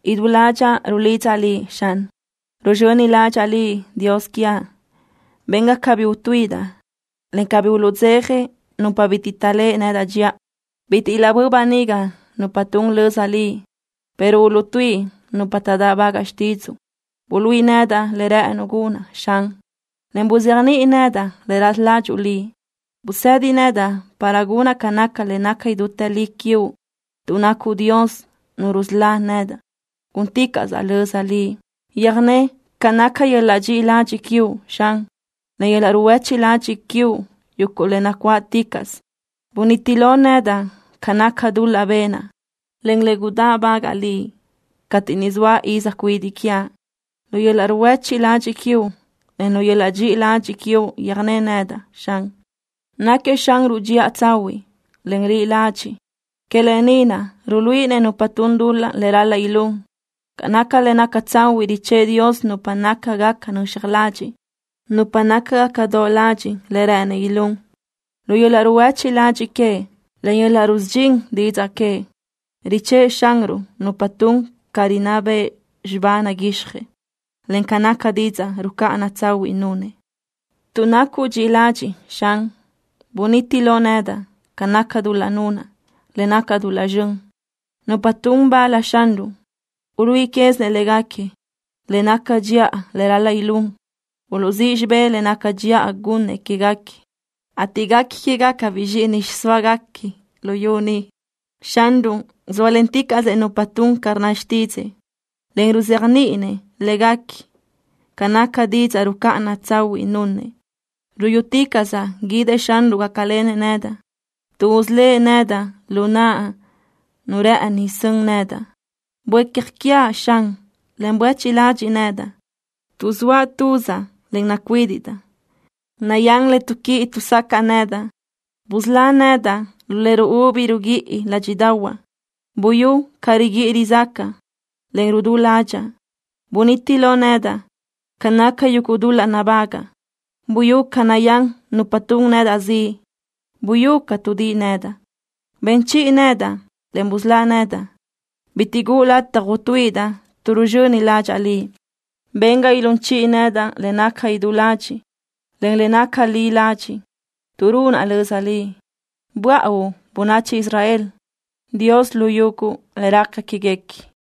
Idú ládxaʼa rulidzaʼ Liʼ, Xan. Ruzxöni ládxaʼa Liʼ, Dios quiaʼ. Ben ga cabí utuíʼidaʼ, en cabí uluʼdzeja nupa bitiʼ taʼléʼe nedaʼ dxiʼa. Bitiʼ ilaʼbö́ʼ böniga nupa tun löza Liʼ, pero uluʼtuíʼi nupa taʼdáʼbagaʼ xtídzuʼu. Buluíʼi nedaʼ le rë́ʼënuʼ gunaʼ, Xan, en buzéajniʼi nedaʼ le raza ládxuʼu Liʼ. Busedi nedaʼ para gunaʼ ca naca le naca idútë li quiuʼ. Tuʼ nacuʼ Dios, Nu rusölá nedaʼ gúnticaʼsaʼ löza Liʼ. Yöjné ca naca yöl-laʼ dxiʼi ladxiʼ quiuʼ, Xan, en yöl-laʼ ruhuéchiʼ ladxiʼ quiuʼ, yuguʼ le nacuáʼticaʼsö. Buniti lo nedaʼ ca naca dul-laʼ benaʼ, en le gudáʼbagaʼa Liʼ cateʼ niʼ zoaʼ iz cuidiʼ quiaʼ. Lu yöl-laʼ ruhuéchiʼ ladxiʼ quiuʼ, en yöl-laʼ dxiʼi ladxiʼ quiuʼ yöjné nedaʼ, Xan. Náquiëʼ Xanruʼ dxiʼa tsahuiʼ, en li ladxiʼ. Que lë ni naʼ ruluíʼinëʼ nupa tun dul-laʼ le ral-laʼ ilún. Ca naca le naca tsahuiʼ richë́ʼë Dios nupa nácagaca nöxaj ladxiʼ, en ruluíʼinëʼ nupa nácagaca doʼ ladxiʼ le rë́ʼënëʼ ilún. Lu yöl-laʼ ruhuéchiʼ ladxiʼ queëʼ, en yöl-laʼ rusudxín didzaʼ queëʼ, richë́ʼë Xanruʼ nupa tun ca rinná bëʼ xibá naguixjëʼ, en ca naca didzaʼ rucáʼana tsahuiʼ nunëʼ. Tuʼ nacuʼ dxiʼi ladxiʼ, Xan, buniti lo nedaʼ ca naca dul-laʼ nunaʼ, le naca dul-laʼ zxön. Nupa tun bal Xanruʼ uluíʼi quézinëʼ léguequi le naca dxiʼa le ral-laʼ ilún. Uluʼzíʼ xibé le naca dxiʼa gunnëʼ quéguequi, ateʼ guequi quégacabiʼ zxíʼini xiʼsóaguequi luyú ni. Xanruʼ zóalenticaʼsëʼ nupa tun ca rnna xtídzëʼë, en ruzéajniʼinëʼ léguequi ca naca didzaʼ rucáʼana tsahuiʼ nunëʼ. Ruyúticaʼsaʼ guídëʼ Xanruʼ gácalenëʼ nedaʼ, tuʼ usölë́ʼ nedaʼ lu naʼ nu rë́ʼëni sön nedaʼ. Buécja quiaʼ, Xan, en buéchiʼ ladxiʼ nedaʼ, tuʼ zoaʼ tuzaʼ, en nacuídiʼdaʼ. Nayán le tuʼquíʼi tuʼsacaʼ nedaʼ. Busölá nedaʼ lu le ruúbi ruguíʼi ládxiʼdaʼahuaʼ. Buyú ca riguíʼi rizácaʼa, en rudú ládxaʼa. Buniti lo nedaʼ ca naca yuguʼ dul-laʼ nabágaʼa. Buyú ca nayán nupa tun nedaʼ ziʼ. Buyú ca tuʼdíʼi nedaʼ. Ben chiʼi nedaʼ, en busölá nedaʼ. Bitiʼ guʼu lataj utuíʼidaʼ tuʼ ruzxöni ládxaʼa Liʼ. Ben ga ilún chiʼi nedaʼ le naca idú ladxiʼ, en le naca li ladxiʼ, tuʼ runaʼ löza Liʼ. Buáʼauʼ bönachi Israel, Dios lu yuguʼ le raca quéguequi.